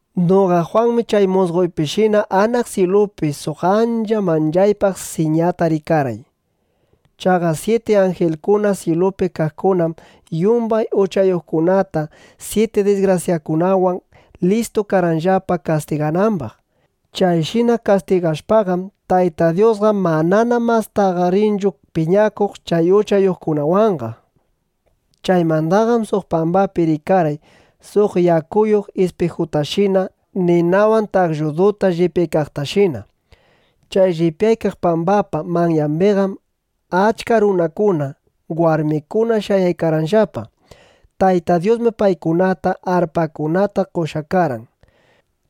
Noqa Jwanmi chay musqoypishina anaq syilupi suq ancha manchaypaq siñata rikarqay. Chaqa syiti anjilkuna syilupi kaqkunam yumbay uchayuqkunata syiti disgrasyakunawan listu karqanllapa kastiganambaq. Chayshina kastigashpaqam, Tayta Dyusqa manana mastaqa rinchu piñakuq chay uchayuqkunawanqa. Chaymandaqam suq pambapi rikarqay suq yakuyuq ispijutashina ninawan taqlluduta llipyaykaqtashina. Chay llipyaykaq pambapa manyambiqam achka runakuna, warmikuna shayaykarqanllapa. Tayta Dyusmi paykunata arpakunata qoshqa karqan.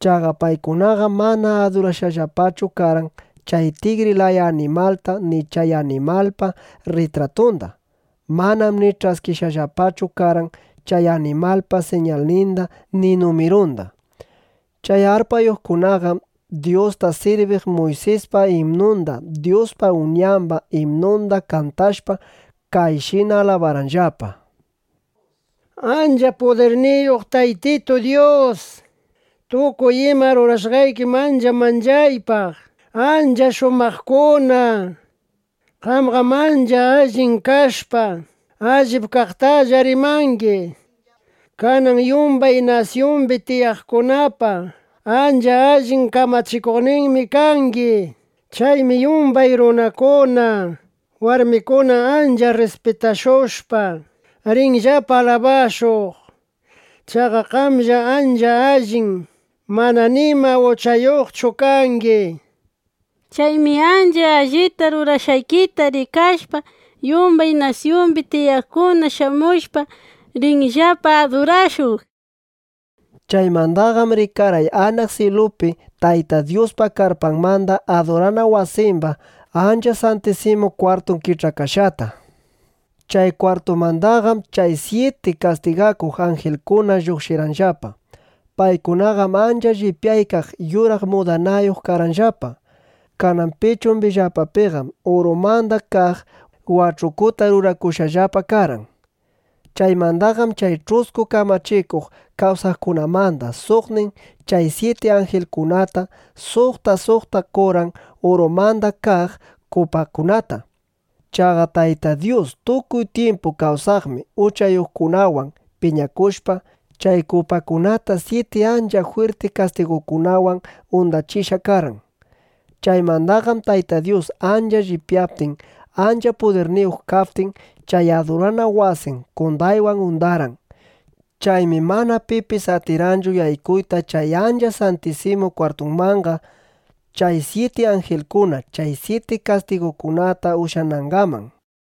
Chaqa paykunaqam mana adurashqallapachu karqan chay tigri laya animalta ni chay animalpa rritratunda. Manam ni ch'askishqallapachu karqan chay animalpa siñalninda ni numirunda. Chay arpayuqkunaqam Dyusta sirbiq Muysispa imnunda, Dyuspa Uñamba imnunda kantashpa, kayshina alabarqanllapa: ¡Ancha pudirniyuq Taytitu Dyus, tukuy ima rurashqaykim ancha manchaypaq, ancha shumaqkuna! Qamqam ancha allin kashpa, allip kaqtalla rimangi. Kanan yumbay nasyumbi tiyaqkunapa ancha allin kamachikuqninmi kangi. Chaymi yumbay runakuna, warmikuna ancha rrispitashushpa, rinllapa alabashuq. Chaqa qamllam ancha allin mana nima uchayuqchu kangi. Chaymi ancha allita rurashqaykita rikashpa, yumbay nasyumbi tiyaqkuna shamushpa, rinllapa adurashuq, nishpa. Chaymandaqam rikarqay anaq syilupi Tayta Dyuspa karpamanda adurana wasimba Ancha Santisimu Kwartun kich'akashqata. Chay kwartumandaqam chay syiti kastigakuq anjilkuna lluqshirqanllapa. Paykunaqam ancha llipyaykaq yuraq mudanayuq karqanllapa. Kanan pichunllapapiqam urumanda kaq wach'ukuta rurakushqallapa karqan. Chaymandaqam chay ch'usku kamachikuq kawsaqkunamanda suqnin chay syiti anjilkunata suqta suqta qorqan urumanda kaq kupakunata. Chaqa Tayta Dyus tukuy tyimpu kawsaqmi uchayuqkunawan piñakushpa, chay kupakunata syiti ancha jwirti kastigukunawan undachishqa karqan. Chaymandaqam Tayta Dyus ancha llipyaptin, ancha pudirniyuq kaptin, chay adurana wasin qondaywan undarqan. Chaymi mana pipis atirqanchu yaykuyta chay Ancha Santisimu Kwartumanqa, chay syiti anjilkuna chay syiti kastigukunata ushyanangaman.